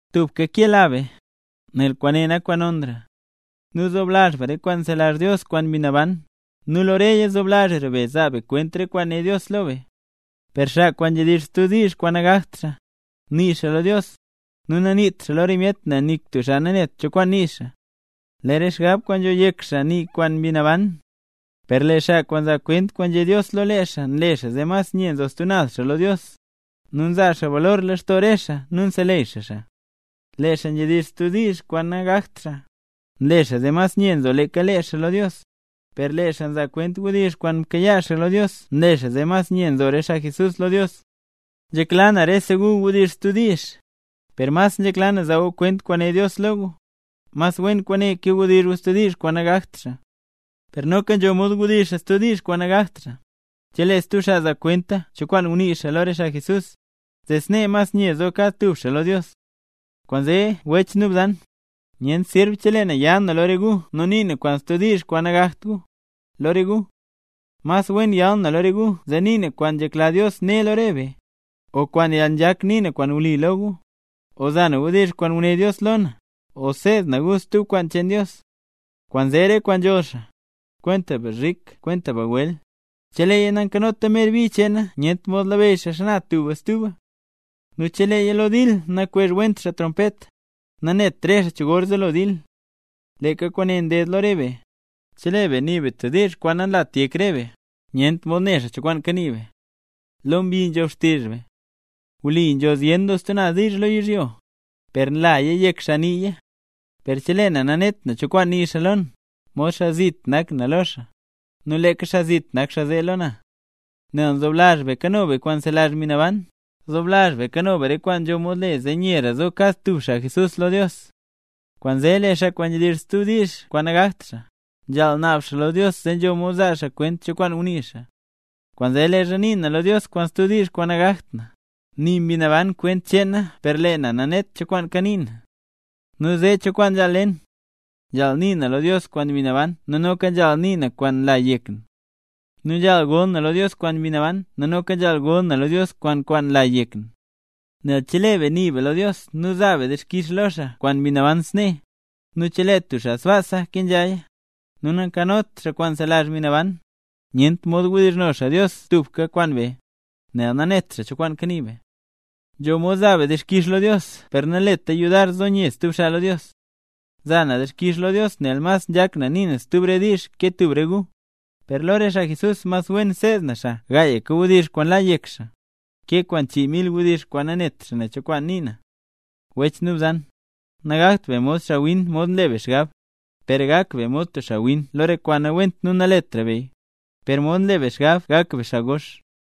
Tubka kela be, nel kwaane nak kwaan nonra. Nu zoblazh be re kwaan nzelazh Dios kwaan Mbi Naban, nu lo reya zoblazhra be zaa be kwent re kwaan né Dios lo be. Per xaa kwaan nzhedizh stub diizh kwaan nagakt xaa, nii xaa lo Dios, nu naniit xaaya lo re myet nel nik tub xaa nanet cho kwaan nii xaa. Lee re xgab kwaan nzho yek xaa nii kwaan Mbi Naban. Per lee xaa kwaan nzaa kwent kwaan nzhé Dios lo lee xaa nle xaa zee mas nye nzo stub naz xaa lo Dios, nu nzaa xaa balor lextoo re xaa nu nseleyy xaa xaa. Lee xaa nzhedizh stub diizh kwaan nagakt xaa, nle xaa zee mas nye nzo leeka lee xaa lo Dios, per lee xaa nzaa kwent wdizh kwaan mkayaa xaa lo Dios nle xaa zee mas nye nzo re xaa Jesús lo Dios. Nzhekla na rese gu wdizh stub diizh, per mas nzhekla na zaa gu kwent kwaan né Dios lo gu, mas wen kwaane ke wdizh xaa stub diizh kwaan nagakt xaa. Per noka nzho mod wdizh xaa stub diizh kwaan nagakt xaa, chelee stub xaa zaa kwent cho kwaan ngunii xaa lo re xaa Jesús, zee snee mas nye zo kad tub xaa lo Dios. Kwaanzee wech nu bzan, nyent sirb chelee na ya na lo re gu nu nii na kwaan stub diizh kwaan nagakt gu, lo re gu. Mas wen yal na lo re gu zee nii na kwaan nzhekla Dios né lo re be, o kwaan yalnzhak nii na kwaan wli lo gu, o za na wdizh kwaan nguné Dios lo na, o seed na gu stub kwaan cheen Dios. Kwaanzee re kwaan nzholl xaa, kwenta bzhik nu kwenta bagwel, cheleeya nakanota mer bi cheena nyent mod labeyy xaa xana tuba stuba. Nu cheleeya lo dil nakwezh went xaa trompet, nanet re xaa cho gor zelo dil. Leeka kwaane nded lo re be, chelee be nii be tub diizh kwaan nanlat yek re be, nyent mod ne xaa cho kwaan kanii be. ¡Lo mbi nzhob xtizh be! Wli nzho zyen doo stub naz diizh lo yizhyo, per nlaya yek xaa niiya. Per chelee na nanet na cho kwaan nii xaa lo na, mod xaa zit nak na lo xaa, nu leeka xaa zit nak xaa zee lo na. Nel nzoblazh be kano be kwaan nzelazh Mbi Naban, zoblazh be kano be re kwaan nzho mod le zee nyera zo kad tub xaa Jesús lo Dios. Kwaanzee lee xaa kwaan nzhedizh stub diizh kwaan nagakt xaa, nzhaal naab xaa lo Dios zee nzho mod zaa xaa kwent cho kwaan ngunii xaa. Kwaanzee leezha nii na lo Dios kwaan stub diizh kwaan nagakt na, nii Mbi Naban kwent cheen na per lee na nanet na cho kwaan kanii na. ¿Nu zee cho kwaan nzhaal le na? Nzhaal nii na lo Dios kwaan Mbi Naban nu noka nzhaal nii na kwaan nla yek na. Nu nzhaal gol na lo Dios kwaan Mbi Naban nu noka nzhaal gol na lo Dios kwaan kwaan nla yek na. Nel chelee be nii be lo Dios nu zaa be dixkix lo xaa kwaan Mbi Naban snee, nu chelee tub xaa sbaasa kenzhaya, nu nakanot xaa kwaan nzelazh Mbi Naban, nyent mod wdizhno xaa Dios tubka kwaan be, nel nanet xaa cho kwaan kanii be. Nzho mod zaa be dixkix lo Dios per naleta yudar zo nye stub xaa lo Dios. Nzaa na dixkix lo Dios nel mas nzhak na nii na stub re diizh ke tub re gu; per lee lo re xaa Jesús mas wen seed na xaa gaayka wdizh kwaan la yek xaa, ke kwaan chii mil wdizh kwaan nanet xaa ne cho kwaan nii na. Wech nu bzan, nagakt be mod xaawin mod nle be xgab, per gak be mod tub xaawin lo re kwaan nawent nu naletra beya, per mod nle be xgab gak be xaa gox.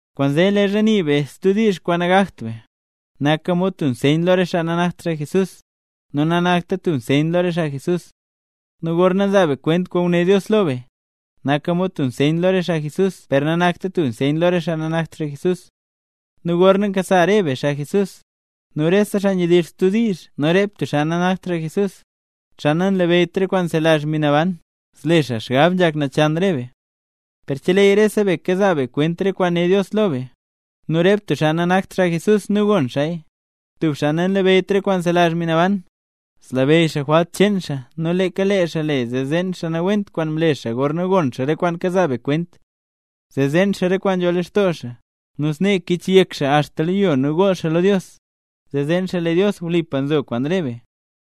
Kwaanzee leezha nii be stub diizh kwaan nagakt be, naka mod tub nseyn lo re xaa nanakt xaa Jesús, nu nanakta tub nseyn lo re xaa Jesús. Nu gorna nzaa be kwent kwaan nguné Dios lo be, naka mod tub nseyn lo re xaa Jesús per nanakta mod tub nseyn lo re xaa nanakt xaa Jesús. Nu gorna nkasa re be, xaa Jesús, nu rese xaa nzhedizh stub diizh nu rep tub xaa nanakt xaa Jesús, xaa nanlabeyyt re kwaan nzelazh Mbi Naban, zle xaa xgab nzhak nachan re be. Per cheleeya rese be kazaa be kwent re kwaan né Dios lo be, nu rep tub xaa nanakt tub xaa Jesús nu gon xaaya, tub xaa nanlabeyyt re kwaan nzelazh Mbi Naban, zlabeyy xaa jwalt cheen xaa nu leeka lee xaa zeen re kwaan nawent kwaan mle xaa gorna gon xaa re kwaan kazaa be kwent. Zee zeen xaa re kwaan nzho lextoo xaa, nu snee kichyek xaa axta lo yo nu gool xaa lo Dios, zee zeen xaa lee Dios wlipa nzo kwaan re be.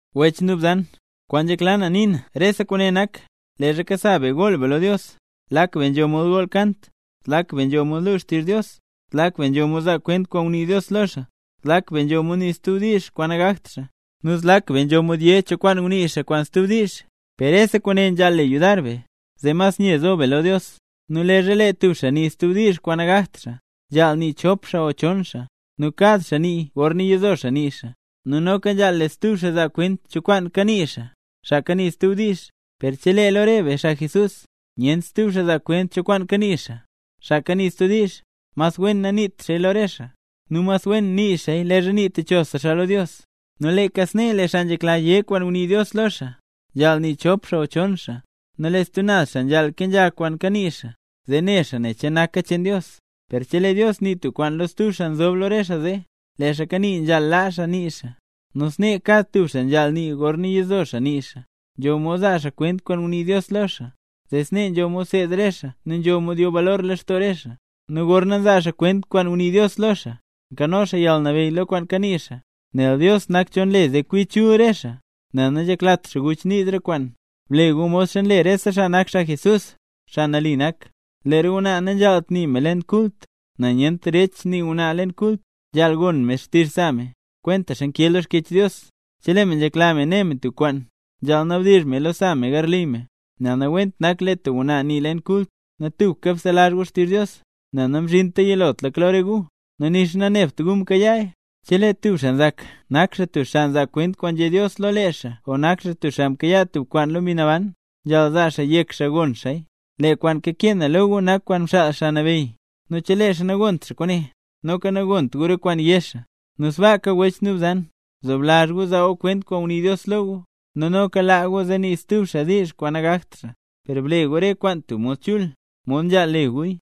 Wech nu bzan, kwaan nzhekla na nii na lo rese kwaane nak, leezha kasa be gool be lo Dios, lak be nzho mod gool kant, zlak be nzho mod lu xtizh Dios, zlak be nzho mod zaa kwent kwaan ngunii Dios lo xaa, zlak be nzho mod nii stub diizh kwaan nagakt xaa, nu zlak be nzho mod yé cho kwaan ngunii xaa kwaan stub diizh, per rese kwaane nzhaal le yudar be, zee mas nye zo be lo Dios. Nu leezha lee tub xaa nii stub diizh kwaan nagakt xaa, nzhaal nii chop xaa o chon xaa, nu kad xaa nii gorna yizo xaa nii xaa, nu noka nzhaal lee stub xaa zaa kwent cho kwaan kanii xaa, xaa kanii stub diizh. Per chelee lo re be, xaa Jesús, nyent stub xaa zaa kwent cho kwaan kanii xaa, xaa kanii stub diizh, mas wen naniit xaaya lo re xaa, nu mas wen nii xaaya leezha nii techosa xaa lo Dios. Nu leeka snee lee xaa nzhekla yé kwaan ngunii Dios lo xaa, nzhaal nii chop xaa o chon xaa, nu lee stub naz xaa nzhaal kenzha kwaan kanii xaa, zee ne xaa che naka cheen Dios. Per chelee Dios nii tub kwaan lo stub xaa nzob lo re xaa zee, lee xaa kanii nzhaal laa nii xaa. Nu snee kad tub xaa nzhaal nii gorna yizo xaa nii xaa, nzho mod zaa xaa kwent kwaan ngunii Dios lo xaa, zee snee nzho mod seed re xaa nu nzho mod yo balor lextoo re xaa. Nu gorna nzaa xaa kwent kwaan ngunii Dios lo xaa, nkano xaa yalnabeyy lo kwaan kanii xaa, nel Dios nak cho nle zee kwi chul re xaa, nel nanzheklat xaa guchniz re kwaan. Ble gu modxa nle rese xaa Jesús, xaa nambey nak, lee re ngwnaa nanzhaalt nii me leen kult, nel nyent derech nii ngwnaa leen kult. Nzhaal gon me xtizh sa me, kwentaxa nkee lo Xkyech Dios. Chelee me nzhekla me né me tub kwaan, nzhaal nabdizh meya lo sa me garli me, nel nawent nak lee tub ngwnaa nii leen kult. Nu tubka bselazh gu xtizh Dios, nel namzhinta yilotlaka lo re gu, nu nixa nanebt gu mkayaaya. Chelee tub xaa nzak nak xaa tub xaa nzaa kwent kwaan nzhé Dios lo lee xaa o nak xaa tub xaa mkayaa tub kwaan lo Mbi Naban, nzhaal zaa xaa yek xaa gon xaaya, lee kwaan kakee na lo gu nak kwaan mxaal Xaa Nabeyy. Nu chelee xaa nagont xaa kwaane, noka nagont gu re kwaan yé xaa. Nu sbaaka wech nu bzan, bzoblazh gu zaa gu kwent kwaan ngunii Dios lo gu, nu noka laa gu zee nii xaa stub diizh kwaan nagakt xaa; per ble gu re kwaane tub mod chul, mod nzhaal le guya.